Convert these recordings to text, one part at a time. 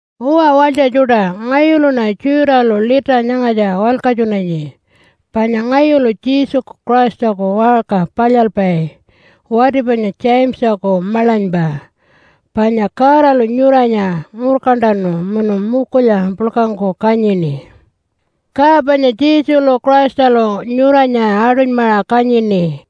Uwa walytja tjuṯa, ngayuluṉa Jude-alu lita nyangatja walkatjunanyi, panya ngayulu Jesuku Christaku waṟka palyalpai, wati panya Jamesaku maḻanypa. Panya Godalu nyuranya ngurkantanu munu mukulya puḻkangku kanyini. Ka panya Jesulu Christalu nyuranya aṯunymaṟa kanyini.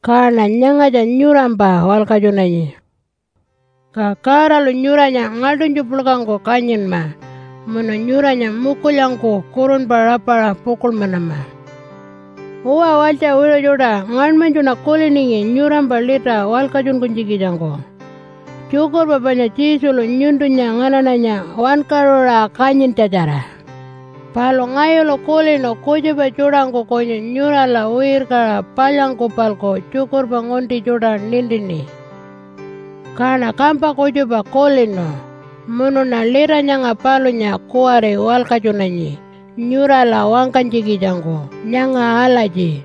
Kaṉa nyangatja nyurampa walkatjunanyi. Ka Godalu nyuranya ngaḻṯunytju puḻkangku kanyinma munu nyuranya mukulyangku kurunpa rapaṟa pukuḻmanama. Uwa walytja wiṟu tjuṯa, ngaṉmanytjuṉa kuliningi nyurampa lita walkatjunkunytjikitjangku tjukurpa panya Jesulu nyuntunya nganaṉanya wankaṟuṟa kanyintjatjara. Palu ngayulu kulinu kutjupa tjuṯangku kunyu nyurala wirkaṟa palyangku-palku tjukurpa ngunti tjuṯa nintini. Kaṉa kampa kutjupa kulinu munuṉa lita nyanga palunya kuwari walkatjunanyi nyurala wangkanytjikitjangku nyanga alatji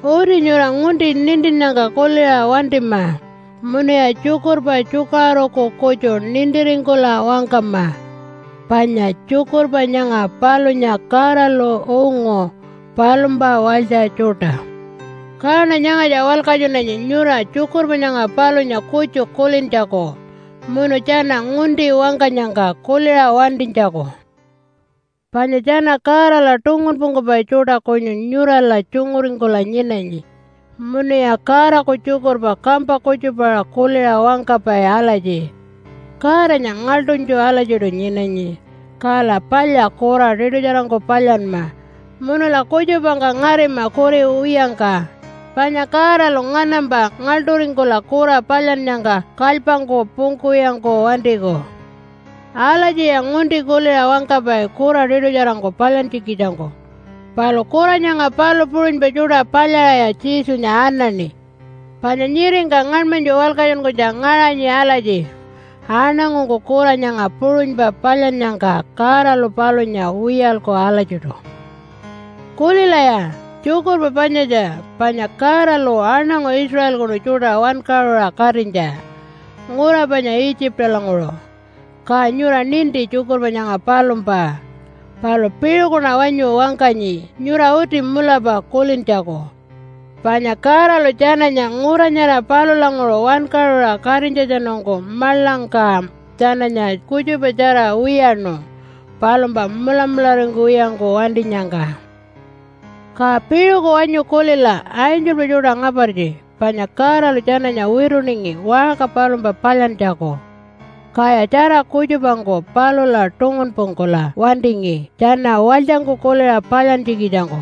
uti nyura ngunti nintinnyangka kuliṟa wantima munuya tjukurpa tjukaṟuruku kutju nintiringkula wangkama. Panya tjukurpa nyanga palunya Godalu ungu palumpa walytja tjuṯa. Kaṉa nyangatja walkatjunanyi nyura tjukurpa nyanga palunya kutju kulintjaku munu tjana ngunti wangkanyangka kuliṟa wantinytjaku. Panya tjana Godala tungunpungkupai tjuṯa kunyu nyurala tjunguringkula nyinanyi munuya Godaku tjukurpa kampa kutjupaṟa kuliṟa wangkapai alatji, “Godanya ngaḻṯunytju alatjiṯu nyinanyi, kala palya kura tiṯutjarangku palyanma munula kutjupangka ngarima kuri wiyangka, panya Godalu nganampa ngaḻṯuringkula kura palyannyangka kalypangku pungkuwiyangku wantiku.” Alatjiya ngunti kuliṟa wangkapai kura tiṯutjarangku palyantjikitjangku. Palu kura nyanga palu puṟunypa tjuṯa palyaṟaya Jesunya anaṉi. Panya nyiringka ngaṉmanytju walkatjunkunytja ngaṟanyi alatji, “Aṉangungku kura nyanga puṟunypa palyannyangka Godalu palunya wiyalku alatjiṯu.” Kulilaya tjukurpa panyatja, panya Godalu aṉangu Israelkunu tjuṯa wankaṟuṟa katinytja ngura panya Itjipalanguṟu. Ka nyura ninti tjukurpa nyanga palumpa, palu piṟukuṉa wanyu wangkanyi nyura uti mulapa kulintjaku. Panya Godalu tjananya ngura nyara palulanguṟu wankaṟuṟa katinytjatjanungku maḻangka tjananya kutjupatjara wiyaṉu palumpa mulamularingkuwiyangku wantinyangka. Ka piṟuku wanyu kulila angelpa tjuṯa ngapartji, panya Godalu tjananya wituningi waṟka palumpa palyantjaku. Kaya tjara kutjupangku palula tungunpungkula wantingi tjana walytjangku kuliṟa palyantjikitjangku.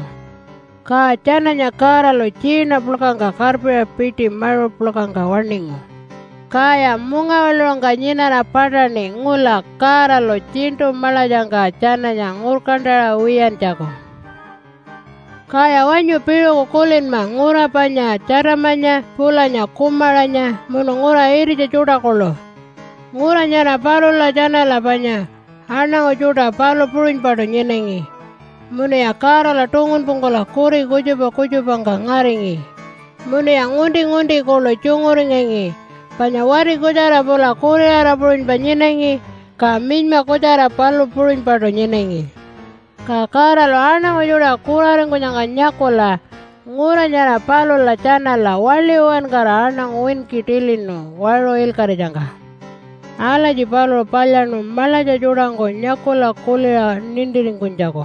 Ka tjananya Godalu tjiina puḻkangka karpiṟa piṯi maṟu puḻkangka waṉingu. Kaya mungawaḻuṟungka nyinara paṯaṉi ngula Godalu tjiṉṯu maḻatjangka tjananya ngurkantaṟa wiyantjaku. Kaya wanyu piṟuku kulinma ngura panya Tjatamanya pulanya Kumaranya munu ngura ititja tjuṯa kuḻu. Ngura nyara palula tjanala panya, aṉangu tjuṯa palu puṟunypaṯu nyinangi munuya Godala tungunpungkula kuri kutjupa kutjupangka ngaringi munuya ngunti-ngunti kuḻu tjunguringangi panya wati kutjara pula kuriṟara puṟunypa nyinangi, ka minyma kutjara palu puṟunypaṯu nyinangi. Ka Godalu aṉangu tjuṯa kuraringkunyangka nyakula ngura nyara palula tjanala waḻi uwankara aṉangu winki tilinu waṟu ilkaṟitjangka. Alatji paluṟu palyaṉu maḻatja tjuṯangku nyakula kuliṟa nintiringkunytjaku.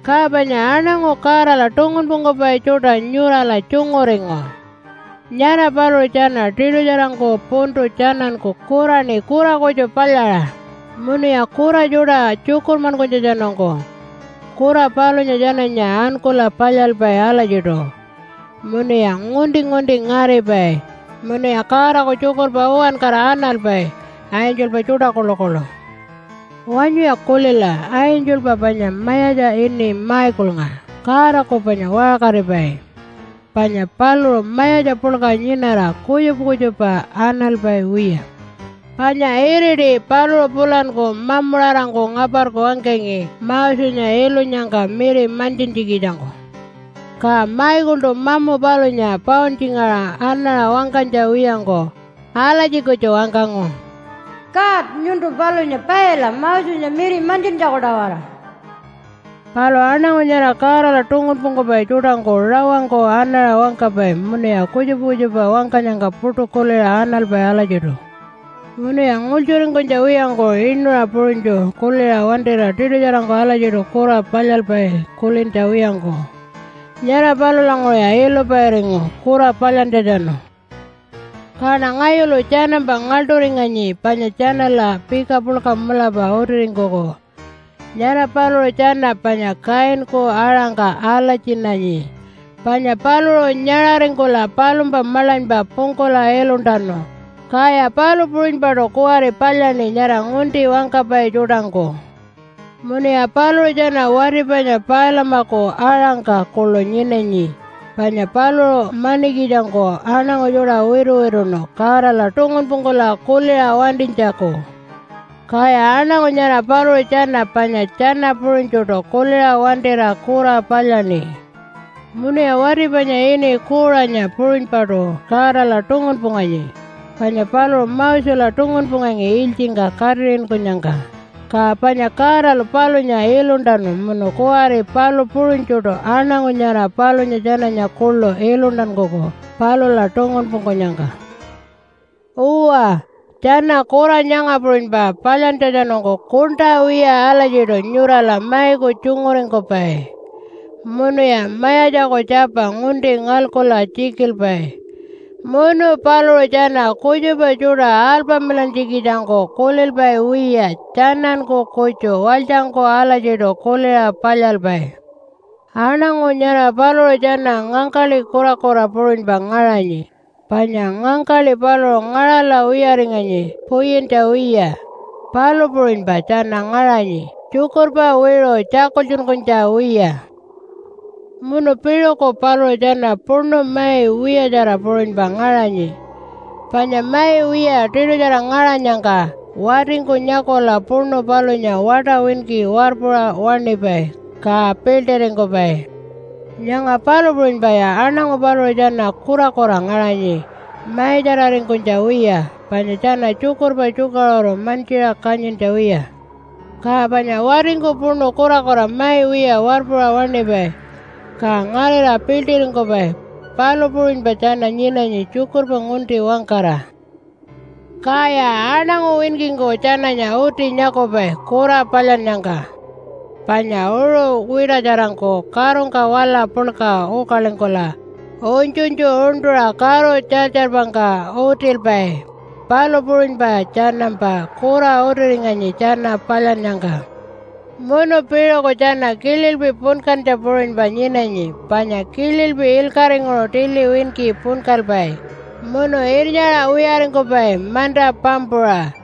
Ka panya aṉangu Godala tungunpungkupai tjuṯa nyurala tjunguringu. Nyara paluṟu tjana tiṯutjarangku puntu tjananku kuraṉi kura kutju palyaṟa, munuya kura tjuṯa tjukurmankunytjatjanungku kura palunya tjananya ankula palyalpai alatjiṯu munuya ngunti-ngunti ngaripai munuya Godaku tjukurpa uwankara analpai, angelpa tjuṯa kuḻukuḻu. Wanyuya kulila angelpa panya mayatja ini Michaelnga Godaku panya waṟkaripai. Panya paluṟu mayatja puḻka nyinara kutjupa kutjupa analpai wiya. Panya iriti paluṟu pulanku mamuṟarangku ngaparku wangkangi Mosenya ilunyangka miri mantjintjikitjangku. Ka Michaeltu mamu palunya pauntjingaṟa anaṟa wangkanytja wiyangku alatji kutju wangkangu, “God, nyuntu palunya paila Mosenya miri mantjintjaku-tawara.” Palu aṉangu nyara Godala tungunpungkupai tjuṯangku rawangku anaṟa wangkapai munuya kutjupa kutjupa wangkanyangka puṯu kuliṟa analpai alatjiṯu. Munuya ngultjuringkunytja wiyangku inuṟa puṟunytju kuliṟa wantira tiṯutjarangku alatjiṯu kura palyalpai kulintja wiyangku. Nyara palulanguṟuya ilupairingu kura palyantjatjanu. Kaṉa ngayulu tjanampa ngaḻṯuringanyi panya tjanala pika puḻka mulapa utiringkuku. Nyara paluṟu tjana panya Kainku aṟangka alatjinanyi, panya paluṟu nyaṟaringkula palumpa maḻanypa pungkula iluntanu, kaya palu puṟunypaṯu kuwari palyaṉi nyara ngunti wangkapai tjuṯangku. Munuya paluṟu tjana wati panya Pailamaku aṟangka kuḻu nyinanyi, panya paluṟu manikitjangku aṉangu tjuṯa wituwituṉu Godala tungunpungkula kuliṟa wantinytjaku. Kaya aṉangu nyara paluṟu tjana panya tjana puṟunytjuṯu kuliṟa wantira kura palyaṉi. Munuya wati panya ini Kuṟanya puṟunypaṯu Godala tungunpunganyi, panya paluṟu Mosela tungunpungangi ilytjingka katiṟinkunyangka, ka panya Godalu palunya iluntanu munu kuwari palu puṟunytjuṯu aṉangu nyara palunya tjananya kuḻu iluntankuku palula tungunpungkunyangka. Uwa, tjana kura nyanga puṟunypa palyantjatjanungku kuṉṯa wiya alatjiṯu nyurala maiku tjunguringkupai munuya Mayatjaku Tjapa ngunti ngalkula tjikilpai. Munu paluṟu tjana kutjupa tjuṯa alpamilantjikitjangku kulilpai wiya tjananku kutju walytjangku alatjiṯu kuliṟa palyalpai. Aṉangu nyara paluṟu tjana ngangkaḻi kurakura puṟunypa ngaṟanyi, panya ngangkaḻi paluṟu ngaṟala wiyaringanyi puyintja wiya, palu puṟunypa tjana ngaṟanyi tjukurpa wiṟu tjakultjunkunytja wiya. Munu piṟuku paluṟu tjana puṉu mai wiyatjara puṟunypa ngaṟanyi, panya mai wiya tiṯutjara ngaṟanyangka watingku nyakula puṉu palunya waṯa winki warpuṟa waṉipai, ka piḻṯiringkupai. Nyanga palu puṟunypaya aṉangu paluṟu tjana kurakura ngaṟanyi maitjararingkunytja wiya, panya tjana tjukurpa tjukaṟuru mantjiṟa kanyintja wiya. Ka panya watingku puṉu kurakura mai wiya warpuṟa waṉipai ka ngarira piḻṯiringkupai, palu puṟunypa tjana nyinanyi tjukurpa ngunti wangkara. Kaya aṉangu winkingku tjananya uti nyakupai kura palyannyangka. Panya uṟu wiṯatjarangku karungka wala puḻka ukalingkula unytjunytju uṉṯuṟa karu tjartjarpangka utilpai, palu puṟunypa tjanampa kura utiringanyi tjana palyannyangka. Munu piṟuku tjana kililpi punkantja puṟunypa nyinanyi, panya kililpi ilkaṟinguṟu tili winki punkalpai munu irnyaṟa wiyaringkupai manta pampuṟa.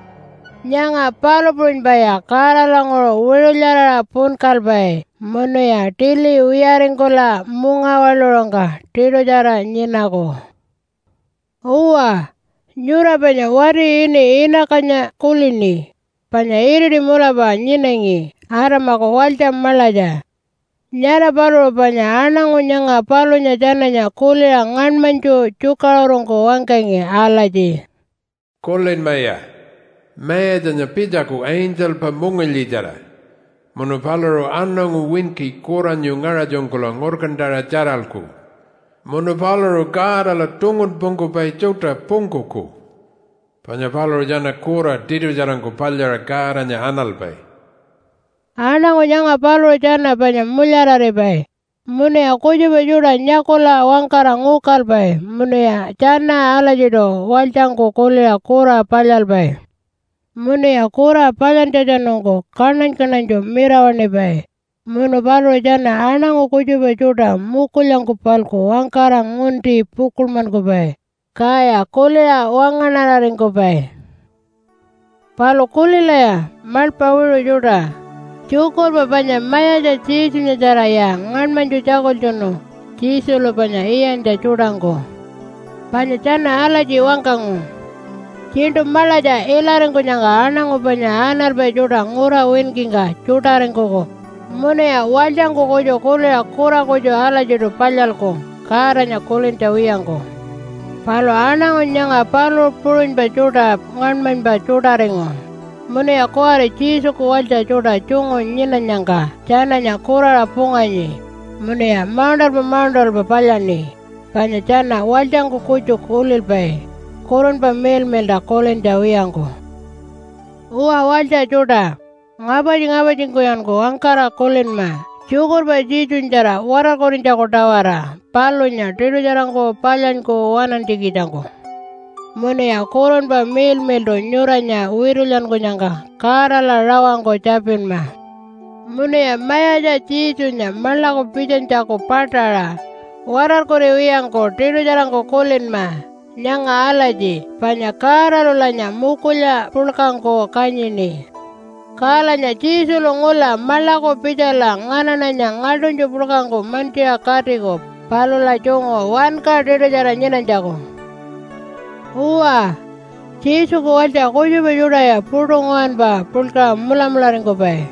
Nyanga palu puṟunypaya Godalanguṟu wiṟulyaraṟa punkalpai munuya tili wiyaringkula mungawaḻuṟungka tiṯutjara nyinaku. Uwa, nyura panya wati ini Iinakanya kulini panya iriti mulapa nyinangi Adamaku walytja maḻatja. Nyara paluṟu panya aṉangu nyanga palunya tjananya kuliṟa ngaṉmanytju tjukaṟurungku wangkangi alatji, “Kulinmaya, Mayatjanya pitjaku angelpa mungilyitjara. Munu paluṟu aṉangu winki kuranyu ngaṟatjunkula ngurkantaṟa tjaralku. Munu paluṟu Godala tungunpungkupai tjuṯa pungkuku, panya paluṟu tjana kura tiṯutjarangku palyaṟa Godanya analpai.” Aṉangu nyanga paluṟu tjana panya mulyararipai, munuya kutjupa tjuṯa nyakula wangkara ngukalpai, munuya tjana alatjiṯu walytjangku kuliṟa kura palyalpai. Munuya kura palyantjatjanungku kaṉany-kaṉanytju mirawaṉipai, munu paluṟu tjana aṉangu kutjupa tjuṯa mukulyangku-palku wangkara ngunti pukuḻmankupai, kaya kuliṟa wangaṉararingkupai. Palu kulilaya maḻpa wiṟu tjuṯa, tjukurpa panya mayatja Jesunyatjaraya ngaṉmanytju tjakultjunu Jesulu panya iyantja tjuṯangku. Panya tjana alatji wangkangu, “Tjiṉṯu maḻatja ilaringkunyangka aṉangu panya analpai tjuṯa ngura winkingka tjuṯaringkuku munuya walytjangku kutju kuliṟa kura kutju alatjiṯu palyalku Godanya kulintja wiyangku.” Palu aṉangu nyanga palu puṟunypa tjuṯa ngaṉmanypa tjuṯaringu, munuya kuwari Jesuku walytja tjuṯa tjungu nyinanyangka tjananya kuraṟa punganyi munuya mauṉṯalpa mauṉṯalpa palyaṉi, panya tjana walytjangku kutju kulilpai Kurunpa Miḻmiḻṯa kulintja wiyangku. Uwa walytja tjuṯa, ngapartji-ngapartjingkuyanku wangkara kulinma tjukurpa Jesunyatjara watarkurinytjaku-tawara, palunya tiṯutjarangku palyanyku waṉantjikitjangku. Munuya Kurunpa Miḻmiḻṯu nyuranya witulyankunyangka Godala rawangku tjapinma. Munuya Mayatja Jesunya maḻaku pitjanytjaku paṯaṟa watarkuriwiyangku tiṯutjarangku kulinma nyanga alatji panya Godalulanya mukulya puḻkangku kanyini. Kalanya Jesulu ngula maḻaku pitjala nganaṉanya ngaḻṯunytju puḻkangku mantjiṟa katiku palula tjungu wanka tiṯutjara nyinanytjaku. Uwa, Jesuku walytja kutjupa tjuṯaya puṯu nguwanpa puḻkaṟa mulamularingkupai,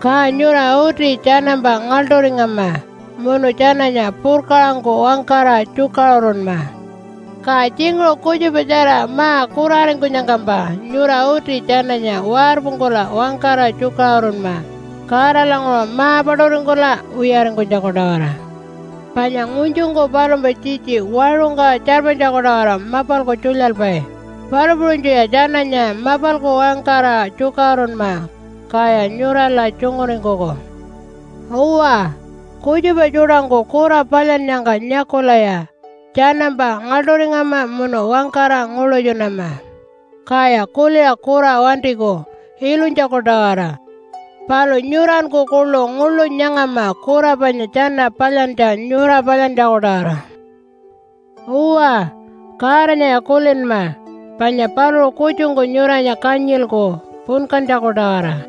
ka nyura uti tjanampa ngaḻṯuringama munu tjananya purkaṟangku wangkara tjukaṟurunma. Ka tjinguṟu kutjupatjara ma-kuraringkunyangkampa nyura uti tjananya warpungkula wangkara tjukaṟurunma Godalanguṟu ma-paṯuringkula wiyaringkunytjaku-tawara. Panya ngunytjungku palumpa tjitji waṟungka tjarpanytjaku-tawara mapalku tjulyalpai, palu puṟunytjuya tjananya mapalku wangkara tjukaṟurunma, kaya nyurala tjunguringkuku. Uwa, kutjupa tjuṯangku kura palyannyangka nyakulaya tjanampa ngaḻṯuringama munu wangkara nguḻutjunama, kaya kuliṟa kura wantiku ilunytjaku-tawara. Palu nyuranku kuḻu nguḻu nyangama kura panya tjana palyantja nyura palyantjaku-tawara. Uwa, Godanyaya kulinma. Panya paluṟu kutjungku nyuranya kanyilku punkantjaku-tawara.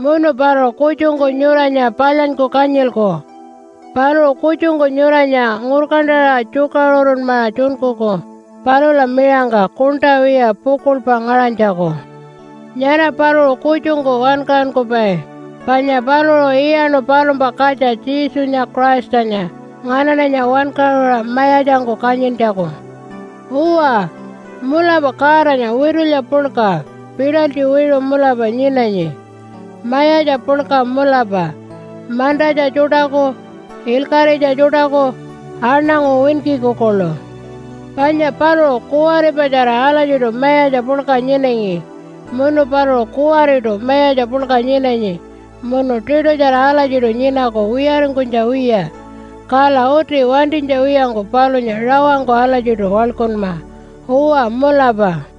Munu paluṟu kutjungku nyuranya palyanyku kanyilku. Paluṟu kutjungku nyuranya ngurkantaṟa tjukaṟurunmaṟa tjunkuku palula miṟangka kuṉṯa wiya pukuḻpa ngaṟanytjaku. Nyara paluṟu kutjungku wankaṟunkupai, panya paluṟu iyaṉu palumpa katja Jesunya Christanya nganaṉanya wankaṟuṟa mayatjangku kanyintjaku. Uwa, mulapa Godanya witulya puḻka, pitalytji wiṟu mulapa nyinanyi, mayatja puḻka mulapa mantatja tjuṯaku, ilkaṟitja tjuṯaku, aṉangu winkiku kuḻu. Panya paluṟu kuwaripatjara alatjiṯu Mayatja puḻka nyinangi, munu paluṟu kuwariṯu Mayatja puḻka nyinanyi munu tiṯutjara alatjiṯu nyinaku wiyaringkunytja wiya. Kala uti wantinytja wiyangku palunya rawangku alatjiṯu waḻkunma. Uwa mulapa.